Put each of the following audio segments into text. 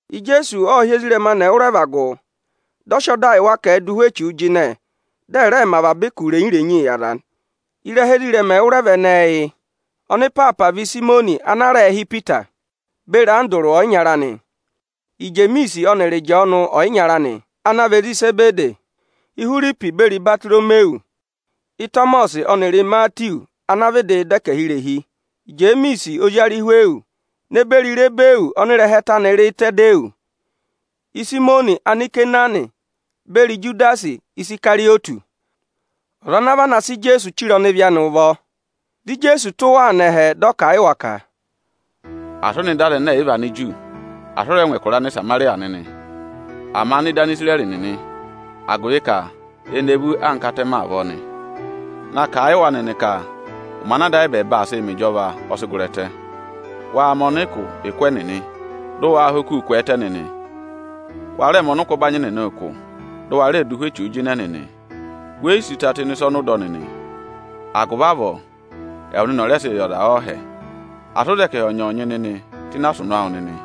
Ijeesu ộ hị́ ezirẹma anị ẹwụrẹva gụ, dị ọ sị ọda yị wa ka ẹ̀ẹ dụ ụhwẹ echuu jịnẹ, dị ẹ̀ rẹẹ mẹ avaba ụkụ irenyi-irenyii yị aza nị. Ịrẹha ezirẹma ẹwụrẹva ẹnẹẹ yị: Ọnịpaapa vị Ịsayịmọnị ana a rẹẹ̄ hị́ Ipita, beri Andụrụ ọyịnyara anị; Ijemiisi ọnịrị Ịjọọnụ ọyịnyara anị; ana vị ezi Izebedi; Ihwiripi beri Ibatoromiwu; Ịtọmọsị ọnịrị Imatiwu ọdẹkẹhirehi, Ijemiisi ozi Arịhwịyọsị, ne beri Ịtadịyọsị; Ịsayịmọnị Anikenaani beri Ijudasi Isikarịyọtị, ọza ana vana sị Ijeesu chire ọnịvị anị ụvọ. Dị Ijeesu tụ́ wa nọ ẹhẹ, dị ọ kà a yị wa ka: Asị ẹ nọ ịdị Anigiriki u! Asị ẹ rẹ ngụ ẹkụra Anịsamarịya nịnị. Ama nọ ịdị Anisirẹrị nịnị, agụvị ka eni e vú anka atẹmẹ avọọ nị! Na kà a yị wa nịnị ka ụmẹ ana Ada ayị ẹbẹẹba aa sịị mẹ ịjọva ọ sị gụrị ẹtẹ. Waa mẹ ọnịkụ ụkụ ẹnịnị, dị ụ waa ha okuu kwẹẹtẹ nịnị! Waa rẹẹ mẹ ọnịkụ ọbanyị nịnị ụkụ, dị ụ wa rẹẹ dụ ụhwẹ echuu jịnẹ nịnị! We yi sí ụta tụ́ ịnị ịsa ọnị ụ dọ nịnị; agụvị avọọ ẹwụ nịnị ọ̀ rẹẹ sị yị aza ọọhẹ! Asị ụ za ẹkẹhị ọnyọọnyị nịnị tụ́ ịnị asụnụ awụ nịnị!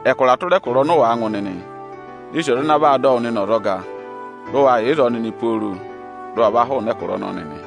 “Ẹkụra tụra ẹkụra ọnị ụ wàa ngụ nịnị, ne sì ọza ana vaa dọ wụ nịnị ọzọga, dị ụ wa yà ịzọọ nịnị pooro dị ụ wa va hụụnị ẹkụra ọnọọ nịnị!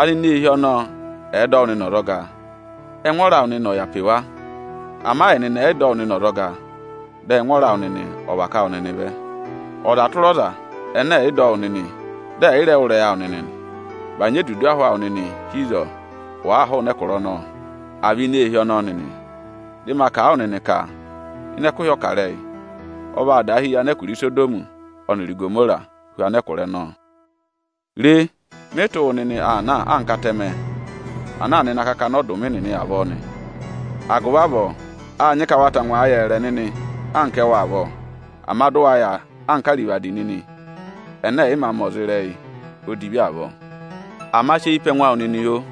Anineehi ọnọọ ẹ̀ẹ dọ wụ nịnị ọzọga, ẹngwọọrọ awụ nịnị ọ̀ yà pe wa. Ama ẹnịnị ẹ̀ yị dọ wụ nịnị ọzọga, dị ẹngwọọrọ awụ nịnị ọ̀ và ká wụ nịnị vẹ. Ọza tụra ọza ẹnẹ ẹ̀ yị dọ wụ nịnị, dị ẹ̀ yị rẹ wụ́ ịrẹyị awụ nịnị nị, bànyị edudu ahụ awụ nịnị hi ịzọọ, wàaa hụụnị ẹkụra ọnọọ, àa vị ini eehi ọnọọ nịnị. Ịzẹyịza, dị ma kà a wụ nịnị ka ịnị ẹkụhị ọkarẹyị, ọ vaa daahi yị anẹkụra Isodọmị ọnịrị Igomora hu anẹkụra ọnọọ.” “Re, mị tụ́ wụ nịnị aa na anka atẹmẹ ana aa nọ ịnị akakana akatapooro nịnị avọọ nị. Agụvị avọọ â nyị ka wa tangwa yẹẹrẹ nịnị anka ẹwụ avọọ, ama dụ wa yà anka arivadi nịnị ẹnẹ ẹ̀ yị mā mẹ ọza ịrẹyị odivi avọọ. Ama sị eyi pe ẹngụ awụ nịnị, oo!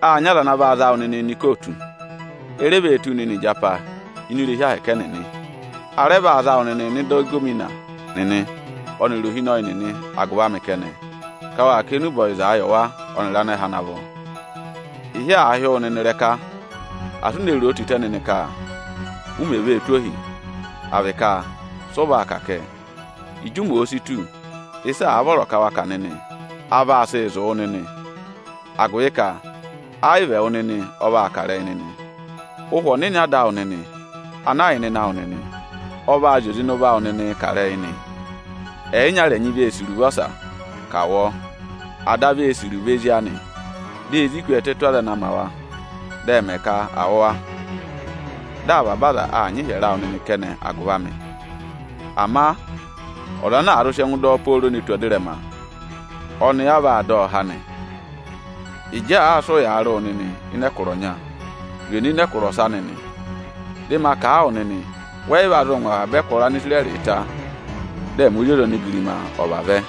Â nyị aza ana vaa za wụ nịnịị nọ ikootu. E re vee tụ́ wu nịnị ịjapa ini irehi ahẹkẹ Aniju ẹnịnị. A rẹ vaa za wụ nịnịị nọ ịda ịgọvọnọ nịnị ọnịrị ohinọyị nịnị agụvị amị kẹnẹ, ka wa kà enube ọyịza yị wa ọnịrị anẹhẹ ana vọ. Ịhị àa hị́ wụ nịnị ịrẹka, asị u ne roo tịtẹ nịnị ka u mè vee tụ́ ohi, à vị ka sị ụ vaa kà kẹ! Ịjị ụmẹ òo si tù, ịsị àa vọrọ ka wa kà nịnị, a vaa sị zụ̀ wụ nịnị. Agụvị ka ẹ yị vị ẹwụ nịnị ọ vaa kà ịrẹyị nịnị. Ụhwẹ Ọnịnị Ada awụ nịnị ana yà ịnịnẹ awụ nịnị, ọ vaa zị oze ịnị ụvọ awụ nịnịị kà ịrẹyị nị. Ẹyịnyara ẹnyị vee sì iruvo ọsa, ka à wụ ọọ. Ada vee sì iruvo ezi anị. Dị ezi kwẹẹtẹ tù aza ana ma wa, dị ẹ mẹ ka à wụ̀ wa. Dị avaba aza aa nyị ịhyẹrẹ awụ nịnị kẹnẹ agụvị amị. Ama ọza ana àa zụ sị ẹngụ dọ ọ pooro ne tù ẹzẹtẹ, ọnị a vaa dọ ọ há nị. Ịjị àaa sị ụyaa rị wụ nịnị ịnị ẹkụra ọnya, zwe nọ ịnị ẹkụra ọsa nịnị! Dị ma kà a wụ nịnị, wẹ yị va zụụ ngụ avaba ẹkụra Anisirẹrị ta, dị ẹmị Ozi ọza onigirima ọ̀ vavẹ.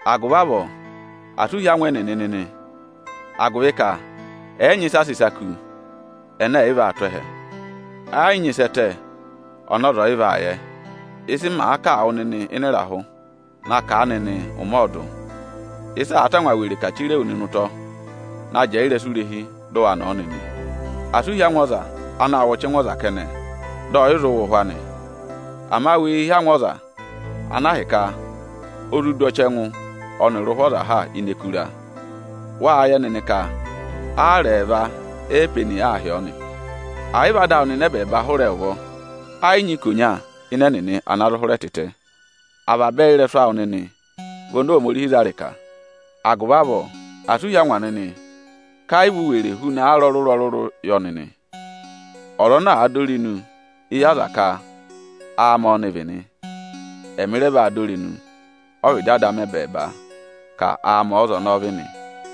“Agụvị avọọ asị u hí angwa ẹnịnị nịnị! Agụvị ka ẹyị nyị ịsị a sị ịsa kú, ẹnẹ ẹ̀ yị vaa tụ́ ẹhẹ; ẹ yị nyị ịsị ẹ tẹ, ọnị ọza ọ̀ yị vaa yẹ. Ịsị màa kà wụ nịnị ịnị ịrahụ, na kà a nịnị ụmẹ ọọdụ! Ịsa àa tangwa were kà chire wu nịnị ụtọ, na jẹẹ ịrẹsụ irehi, dụ wa nọ̀ ọ nịnị! Asị u hí angwa aza anaā wụ ọchẹngụ ọza kẹnẹ, ama dị ọ̀ yị zụ wụ ụhwẹ anị. Ama wee hí angwa ọza ana ahịka o zụ du ọchẹngụ ọnịrị ụhwẹ ọza ha ini ẹkụra! Wáá yẹ nịnị ka aara ẹẹva eepeni aa hị́ ọọ nị? Ẹ̀ yị vị Ada awụ nịnị ẹbẹẹba hụrẹ ụvọ, ẹ yị nyị ikonya ịnị ẹnịnị ana zụ hụrẹ tịtẹ. Avaba ẹyị ị́rẹsụ awụ nịnị vị oni Ohomorihi za ịrịka. Agụvị avọọ, asị u hí angwa nịnị ka ẹ yị vị u were huna aara ọrụrụ-ọrụrụ yọ nịnị! Ọza ana àa dọ irenu éyi aza ka áamị ọ́nị vị nị, ẹmị rẹ vaa dọ irenu ọ́vịdị Ada amị ẹbẹẹba ka áamị ọ́za ọnọọ vị nị.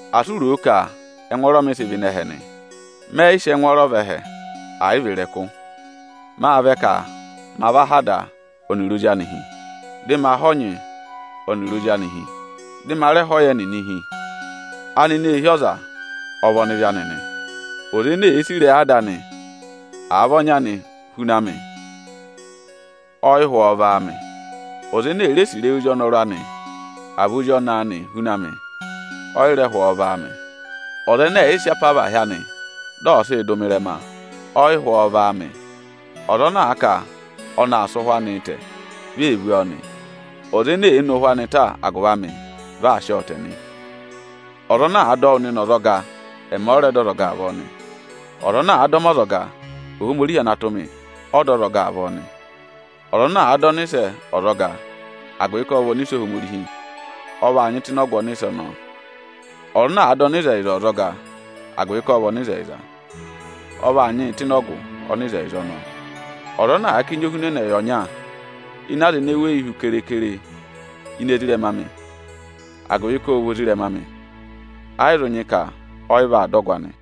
“Asị u ro o ka ẹngwọọrọ mị sị vẹ ịnị ẹhẹ nị. Mẹ yị sị ẹngwọọrọ vẹ ẹhẹ, ẹ̀ yị vị ịrẹkụ. Mâ vẹ ka ma va há ada ọnịrị ozi anị hi, dị ma há ọnyị ọnịrị ozi anị hi, dị ma rẹ há ọyẹ nịnị hi. Anineehi ọza ọ vị ọnịvị anị nị. Ọza ene èe sì ịrẹyị ada anị, àa vị ọnyị anị huna mị, ọ yị hụ ọ vị áamị. Ọza ene èe re sì ịrẹyị ozi ọnọrụ anị, àa vị ozi ọnẹẹ anị huna mị, ọ yị rẹ hụ ọọ vị áamị. Ọza ẹnẹ ẹ̀ yị sị apavahị anị dị ọ̀ sịị dụ mị ịrẹma, ọ yị hụ ọ vị áamị. Ọza ana àa ka ọnị aa sị ụhwẹ anịị tẹ, vi ee vú ọọ nị. Ọza ene èe ne ụhwẹ anị ta agụvị amị, vị aa sị ọọ tẹ nị. “Ọza ana àa dọ wụ nịnị ọzọga, ẹmị ọ rẹ dọ ọzọga avọọ nị. Ọza ana àa dọ mị ọzọga, Ohomorihi ana tụ́ mị, ọ dọ ọzọga avọọ nị. Ọza ana àa dọ ọnịsẹ ọzọga, agụvị ka ộ vị ọnịsẹ Ohomorihi, ọ vaa nyị tụ́ ịnị ọgụ ọnịsẹ ọnọọ. Ọza ana àa dọ ọnịzẹyịza ọzọga, agụvị ka ộ vị ọnịzẹyịza, ọ vaa nyị tụ́ ịnị ọgụ ọnịzẹyịza ọnọọ. Ọza ana àa ká enyi ohunẹnẹ yị ọnya ịnị aza ene èe weyi hu keekere ini ezirẹma amị, agụvị ka ộ vị ozirẹma amị, ayị zụ nyị ka ọ yị vaa dọ ọgụ anị.”